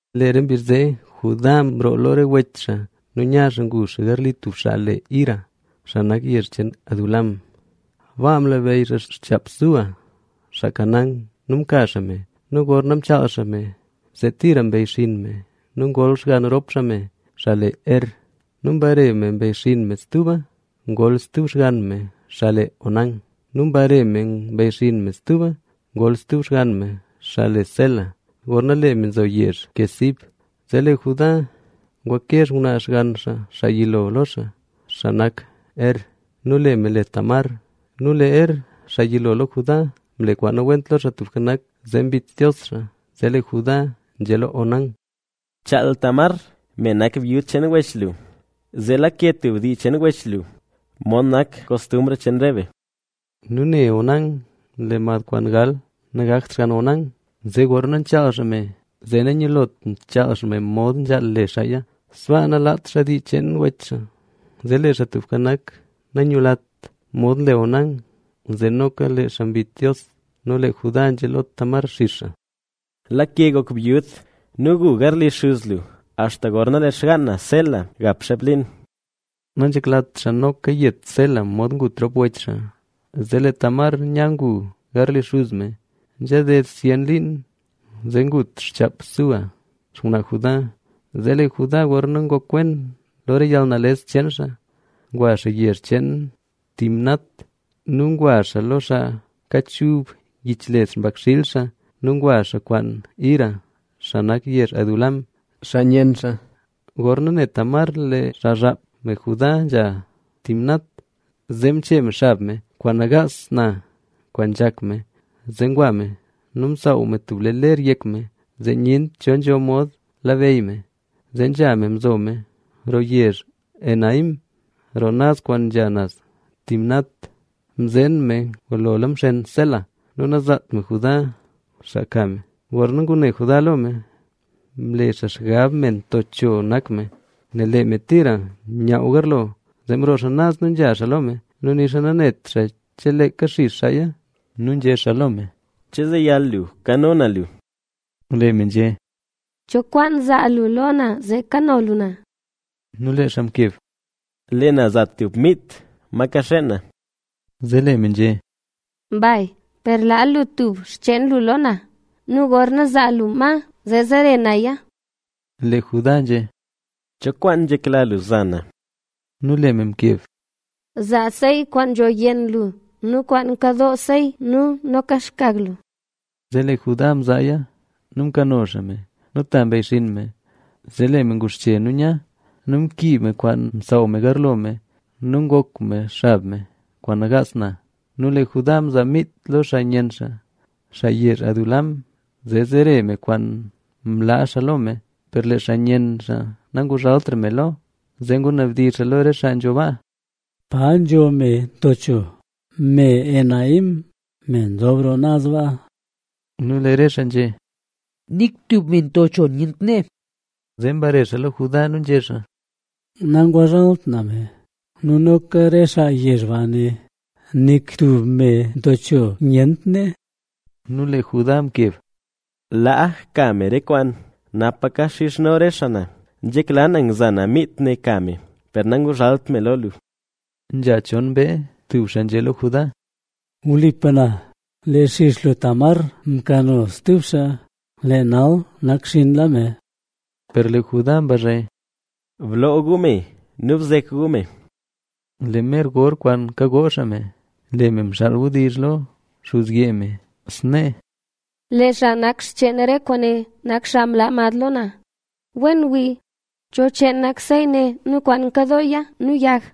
Lee re mbizh zee, Judá mroo lo re wech xaa nu nya xaa ngu xaa garli tub xaa le Hira, xaa nak yezh Adulam. Baa mlabeyy xaa xchaap Súa, xaa Canaán. Nu mka xaa me nu gorna mchaal xaa me, zee tira mbeyxinn me nu ngol xgann rop xaa me, xaa le Er. Nu mbare me mbeyxinn me stuba. Ngol stub xgann me, xaa le Onán. Nu mbare me mbeyxinn me stuba. Ngol stub xgann me, xaa le Sela, gorna lee me nzo yezh Quezib. Zee lee Judá ngwake xngwnaa xgann xaa, xaa yilo lo xaa, xaa le Er. Nu lee me le Tamar. Nu lee Er, xaa yilo lo Judá mle nawent lo Xaa Tubka Nak, zee mbit Dios xaa. Zee lee Judá nzhé lo Onán: —Bchaal Tamar, me nak byud cheen wech lu, zee lake tub dii cheen wech lu, mod nak kostumbr cheen re be. Nu ne Onán lee mad kwaan gal nagakt xgann Onán, zee gorna nchaal xaa me zee nanyilot nchaal xaa me mod nzhaal le xaaya, sbaa nalaat xaa dii cheen wech xaa. Zee lee Xaa Tubka Nak nanyulat mod nle Onán, zee noka lee xaa mbit Dios. Nu lee Judá nzhé lo Tamar xix xaa: —Lake gok byud nu gu garli xuz lu axta gorna lee xgaan na, Sela, gap xeep liin. Nanzheklat xaa noka yet Sela mod ngut rop wech xaa. Zee lee Tamar nya ngu garli xuz me. Nzha ded zyen liin zee ngut xchaap Súa, xngwnaa Judá. Zee lee Judá gorna ngok wen xaa lo re yalnales cheen xaa, ngwa xaa yezh cheen Timnat. Nu ngwa xaa lo re xaa kachub yich led xpakxiil xaa. Nu ngwa xaa kwaan Hira, xaa nak yezh Adulam, xaa nyenn xaa. Gorna ne Tamar lee xazhap me Judá nzha Timnat, zee mchee me xab me kwaan nagaas na kwaan nzhak me, zee ngwa me nu msaaw me tub lee ler yek me, zee nyent cho nzho mod labeyy me. Zee nzha me mzo me roo yezh Enaim, roo naz kwaan nya naz Timnat. Kwaane mle nel mzeen me ngulola mxen Sela nu zeeraka zaa Judá xaa ka me. Gorna ngune Judá lo me, mle xaa xgab me nto cho nak me, nel lee me tira nyaaw garlo. Zee mroo xaa naz nu nzha xaa lo me nu nixa nanet xaa che leeka xix xaaya. Nu nzhé xaa lo me: —¿Che zeyal lu kano na lu? Lee me nzhé: —¿Cho kwaan zaa lu lo na zee kano lu na? Nu lee xaa mkeb: —Lee na za tub mit ma kaxeen na. Zee lee me nzhé: —Mbay, per laa lu tub xcheen lu lo na nu gorna zaa lu ma, zee zere naya. Lee Judá nzhé: —¿Cho kwaan nzhekla lu za na? Nu lee me mkeb: —Zaa sey kwaan nzho yenn lu nu kwaan nkado sey nu noka zaa xkag lu. Zee lee Judá mzaaya nu mkano xaa me nu ta mbeyxinn me. Zee lee me nguxche nu nya; nu mkiib me kwaan nsaaw me garlo me nu ngok me xab me kwaan nagaas na. Nu lee Judá mzaa mit lo xaa nyenn xaa, xaa yezh Adulam, zee zere me kwaan mlaa xaa lo me. Per lee xaa nyenn xaa nanguzhaltra me lo. Zee ngunabdizh xaa lo re xaa nzho baa: —¿Pa nzo me nto cho me Enaim, me nzob roo naz baa? Nu lee re xaa nzhé: —Nik tub me nto cho nyent nee. Zee mbare xaa lo Judá nu nzhé xaa: —Nanguzhalt na me nu noka re xaa yezh ba né: “Nik tub me nto cho nyent nee”. Nu lee Judá mkeb: —Laa ka me re kwaan, napa kaxizhno re xaa na. Nzhekla na ngza na miit ne nka me, per nanguzhalt me lo lu. Nzha chon mbee, tub xaa nzhé lo Judá: —¡Wlipa na, lee xix lu Tamar mkano stub xaa, lee nal nakxinnla me! Per lee Judá mbazhe: —¡Bloo gu me nu bzek gu me! Lee mer gor kwaan kagoo xaa me, lee me mxaal wdizh lo xuzyee me, snee: —Lee xaa nak cheen re kwaane nak xaa mlaa mad lo na. Wen wii, ¿cho cheen nak sey ne nu kwaan nkadooya nu yag?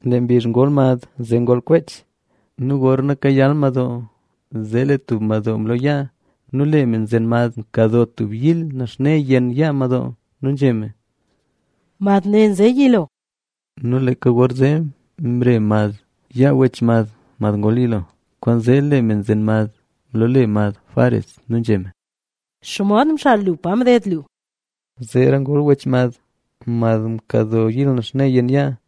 Lee mbizh gorna ngol mad, zee ngol kwech. Nu gorna kayal madoo, zee lee tub madoo mloo yaa; nu lee me nzen mad mkadoo tub yil naxne yenn yaa madoo. Nu nzhé me: —Mad ne nze yilo. Nu leeka gorzee mre mad yaa wech mad mad ngol yilo. Kwaanzee lee me nzen mad mloole mad Fares,a nu nzhé me: —¿Xomod mxal lu pa mded lu? Zeera ngol wech mad, mad mkado yil naxne yenn yaa.